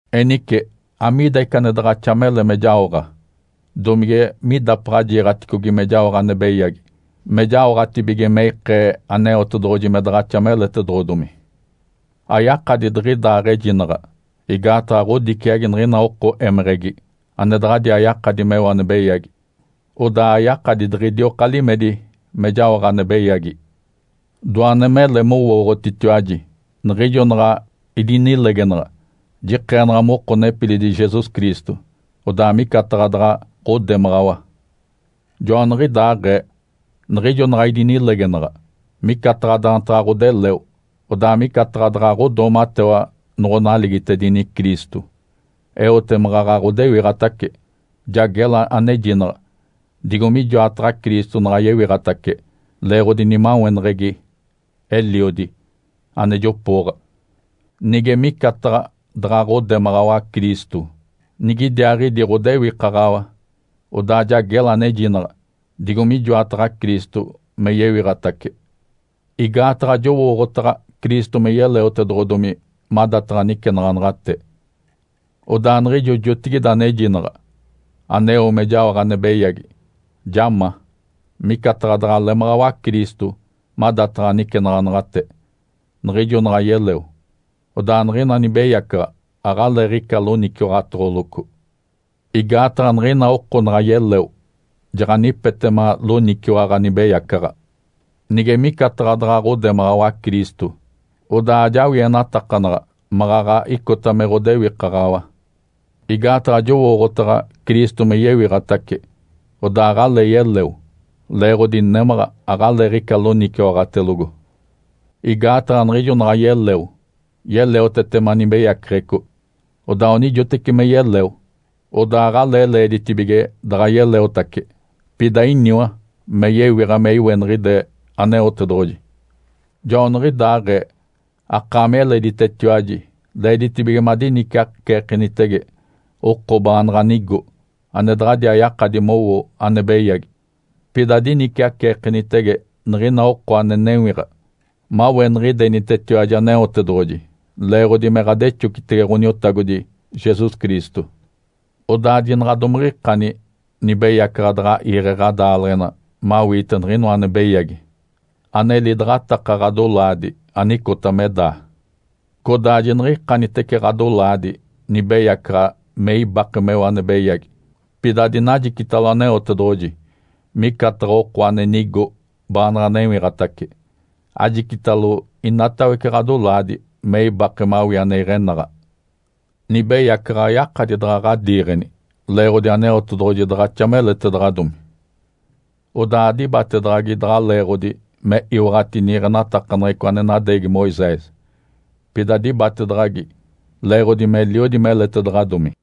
Enice, amiida ica ane daɡ̶axa mele me jaoɡ̶a? Domige midapaɡ̶a jiiɡ̶aticogi me jaoɡ̶a ane beyagi, me jaoɡ̶atibige me ikee Aneotedoɡ̶oji me daɡ̶axa meletedoɡ̶odomi? Ayakadi diɡ̶idaaɡ̶ejinaɡ̶a! Igaataɡ̶a ɡ̶odiciagi niɡ̶ina oko émeɡ̶egi ane daɡ̶adiaa yakadi meo ane beyagi. Odaa ayakadi diɡ̶idioka limedi me jaoɡ̶a ane beyagi. Doane mele mowooɡ̶otitiwaji. Niɡ̶ijo naɡ̶a idinilegenaɡ̶a, jikeenaɡ̶a moko nepilidi Jesus Cristo, odaa micataɡ̶a daɡ̶a ɡ̶odemaɡ̶awa. Joaniɡ̶idaaɡ̶ee, niɡ̶ijo naɡ̶a idinilegenaɡ̶a, micataɡ̶a daantaɡ̶a ɡ̶odeleo, odaa micataɡ̶a daɡ̶a ɡ̶odoomatewa noɡ̶onaligitedini Cristo. Eote maɡ̶aɡ̶a ɡ̶odewiɡ̶atace, ja gela anejinaɡ̶a, digo mijoataɡ̶a Cristo naɡ̶a yewiɡ̶atace leeɡ̶odi nimaweneɡ̶egi Eliodi ane jopooɡ̶a. Nige micataɡ̶a daɡ̶a ɡ̶odemaɡ̶awa Cristo, nigidiaaɡ̶idi ɡ̶odewikaɡ̶awa, odaa ja gela anejinaɡ̶a, digo mijoataɡ̶a Cristo me yewiɡ̶atace. Igaataɡ̶a jowooɡ̶otaɡ̶a Cristo me yeleotedoɡ̶odomi madataɡ̶a nicenaɡ̶anaɡ̶ate. Odaa niɡ̶ijo jotigide anejinaɡ̶a, aneo me jaoɡ̶a ane beyagi, ja ma, micataɡ̶a daɡ̶a lemaɡ̶awa Cristo madataɡ̶a nicenaɡ̶anaɡ̶ate, niɡ̶ijo naɡ̶a yeleo. Odaa niɡ̶ina nibeyacaɡ̶a aɡ̶aleeɡ̶ica loniciwaɡ̶atoɡ̶oloco. Igaataɡ̶a niɡ̶ina oko naɡ̶a yeleo, jaɡ̶anipetema loniciwaɡ̶a nibeyacaɡ̶a. Nige micataɡ̶a daɡ̶a ɡ̶odemaɡ̶awa Cristo, odaa ajawienatakanaɡ̶a maɡ̶aɡ̶a icota me ɡ̶odewikaɡ̶awa. Igaataɡ̶a jowooɡ̶otaɡ̶a Cristo me yewiɡ̶atace, odaa aɡ̶alee yeleo. Leeɡ̶odi némaɡ̶a aɡ̶aleeɡ̶ica loniciwaɡ̶atelogo. Igaataɡ̶a niɡ̶ijo naɡ̶a yeleo, yeleotetema nibeyaceɡ̶eco, odaa onijoteci me yeleo, odaa aɡ̶alee leeditibige daɡ̶a yeleotace. Pida iniwa me yewiɡ̶a me iweniɡ̶ide Aneotedoɡ̶oji. Joaniɡ̶idaaɡ̶ee akaami eleditetiwaji leeditibige madiniciaceekenitege oko baanaɡ̶a nigo, ane daɡ̶adiaa yakadi mowo ane beyagi. Pida adiniciaceekenitege niɡ̶ina oko ane newiɡ̶a maweniɡ̶idenitetiwaji Aneotedoɡ̶oji, leeɡ̶odi me ɡ̶adexocitege Ǥoniotagodi Jesus Cristo. Odaa jinaɡ̶a domiɡ̶ikani nibeyacaɡ̶a daɡ̶a iiɡ̶e ɡ̶adaaleɡ̶ena mawiite niɡ̶inoa ane beyagi ane lidaɡ̶ataka ɡ̶adolaadi anicota me daa. Codaa jiniɡ̶ikanitece ɡ̶adolaadi nibeyacaɡ̶a me ibake meo ane beyagi. Pida adinajicitalo Aneotedoɡ̶oji micataɡ̶a oko ane nigo baanaɡ̶a newiɡ̶atace. Ajicitalo inatawece ɡ̶adolaadi me ibake mawii ane iɡ̶enaɡ̶a. Nibeyacaɡ̶a ayakadi daɡ̶a ɡ̶adiiɡ̶eni. Leeɡ̶odi Aneotedoɡ̶oji daɡ̶axa meletedaɡ̶adomi, odaa adibatedaɡ̶agi daɡ̶a leeɡ̶odi me iwaɡ̶ati niiɡ̶enatakaneɡ̶eco ane nadeegi Moisés. Pida dibatedaɡ̶agi leeɡ̶odi meliodi meletedaɡ̶adomi.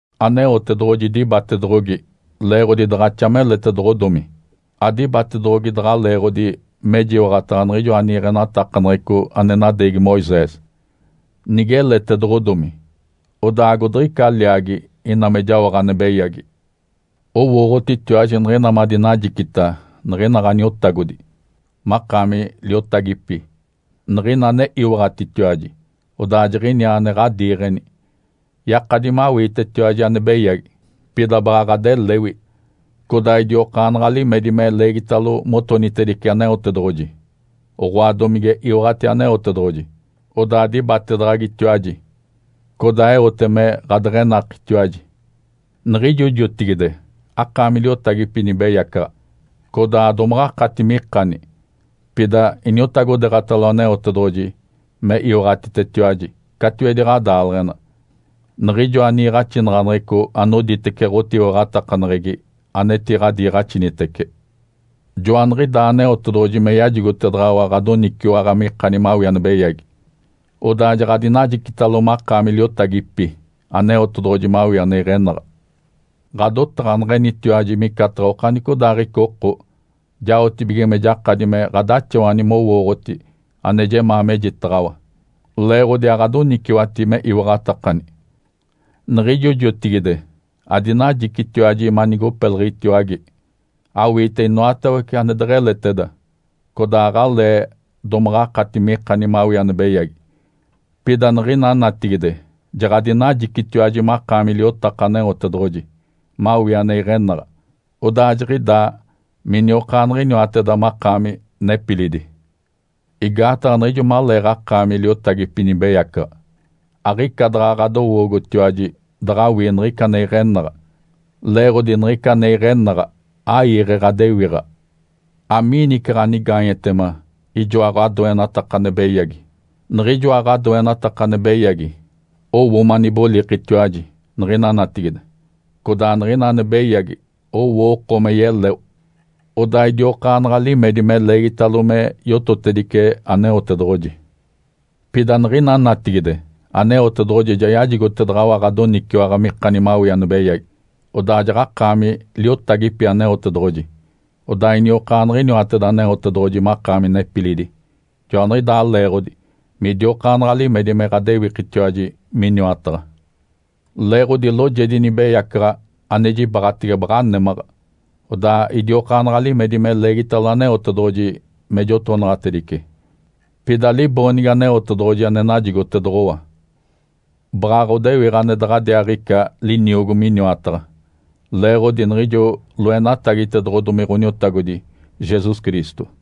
Aneotedoɡ̶oji dibatedoɡ̶ogi leeɡ̶odi daɡ̶axa meletedoɡ̶odomi, adibatedoɡ̶ogi daɡ̶a leeɡ̶odi mejiwaɡ̶ataɡ̶a niɡ̶ijoa niiɡ̶enatakaneɡ̶eco ane nadeegi Moisés. Nigeletedoɡ̶omi, odaa agodiɡ̶ica liaagi ina me jaoɡ̶a ane beyagi? Owooɡ̶otitiwaji niɡ̶ina madinajicita niɡ̶ina ɡ̶aniotagodi makaami liotagipi, niɡ̶ina ane iwaɡ̶atitiwaji odaa jiɡ̶iniaa ane ɡ̶adiiɡ̶eni. Yakadi me awiitetiwaji ane beyagi, pida baɡ̶a ɡ̶adelewi, codaa idiokaanaɡ̶a limedi me leegitalo motonitedice Aneotedoɡ̶oji. Oɡ̶oa domige iwaɡ̶ati Aneotedoɡ̶oji, odaa dibatedaɡ̶agitiwaji, codaa eote me ɡ̶adeɡ̶enakitiwaji. Niɡ̶ijo jotigide akaami liotagipi nibeyacaɡ̶a, codaa adomaɡ̶akati mikani. Pida iniotagodeeɡ̶atalo Aneotedoɡ̶oji me iwaɡ̶atitetiwaji catiwedi ɡ̶adaaleɡ̶ena niɡ̶ijoa niiɡ̶axinaɡ̶aneɡ̶eco anoditece ɡ̶otiwaɡ̶atakaneɡ̶egi anetiɡ̶adiiɡ̶axinitece. Joaniɡ̶idaa Aneotedoɡ̶oji me yajigotedaɡ̶awa ɡ̶adoniciwaɡ̶a mikani mawii ane beyagi. Odaa jaɡ̶adinajicitalo makaami liotagipi Aneotedoɡ̶oji mawii ane iɡ̶enaɡ̶a. Ǥadotaɡ̶aneɡ̶enitiwaji micataɡ̶a okanicodaaɡ̶ica oko jaotibige me jakadi me ɡ̶adaxawani mowooɡ̶oti ane jemaa mejitaɡ̶awa, leeɡ̶odi aɡ̶adoniciwati me iwaɡ̶atakani. Niɡ̶ijo jotigide adinajicitiwaji manigopeliɡ̶itiwage, awiite inoatawece ane deɡ̶eleteda, codaa aɡ̶alee domaɡ̶akati mikani mawii ane beyagi. Pida niɡ̶ina natigide jaɡ̶adinajicitiwaji makaami liotaka Aneotedoɡ̶oji mawii ane iɡ̶enaɡ̶a. Odaa jiɡ̶idaa miniokaaɡ̶iniwateda makaami nepilidi. Igaataɡ̶a niɡ̶ijo maleeɡ̶akaami liotagipi nibeyacaɡ̶a, aɡ̶ica daɡ̶a ɡ̶adowoogotiwaji daɡ̶awii niɡ̶ica ane iɡ̶enaɡ̶a, leeɡ̶odi niɡ̶ica ane iɡ̶enaɡ̶a aiiɡ̶e ɡ̶adewiɡ̶a. Amiini ica ɡ̶anigaanyetema ijoa ɡ̶adoenataka ane beyagi? Niɡ̶ijoa ɡ̶adoenataka ane beyagi owo manibolikitiwaji niɡ̶ina natigide, codaa niɡ̶ina ane beyagi owo oko me yeleo, odaa idiokaanaɡ̶a limedi me leegitalo me yototedice Aneotedoɡ̶oji. Pida niɡ̶ina natigide Aneotedoɡ̶oji ja yajigotedaɡ̶awa ɡ̶adoniciwaɡ̶a mikani mawii ane beyagi, odaa jaɡ̶akaami liotagipi Aneotedoɡ̶oji. Odaa iniokaaniɡ̶iniwateda Aneotedoɡ̶oji makaami nepilidi. Joaniɡ̶idaa leeɡ̶odi midiokaanaɡ̶a limedi me ɡ̶adewikitiwaji Miniwataɡ̶a. Leeɡ̶odi loojedi nibeyacaɡ̶a ane jibaɡ̶atege baɡ̶a némaɡ̶a, odaa idiokaanaɡ̶a limedi me leegitalo Aneotedoɡ̶oji me jotonaɡ̶atedice. Pida liboonigi Aneotedoɡ̶oji ane najigotedoɡ̶owa baɡ̶a ɡ̶odewiɡ̶a ane daɡ̶adiaaɡ̶ica liniogo Miniwataɡ̶a, leeɡ̶odi niɡ̶ijo loenatagitedoɡ̶odomi Ǥoniotagodi Jesus Cristo.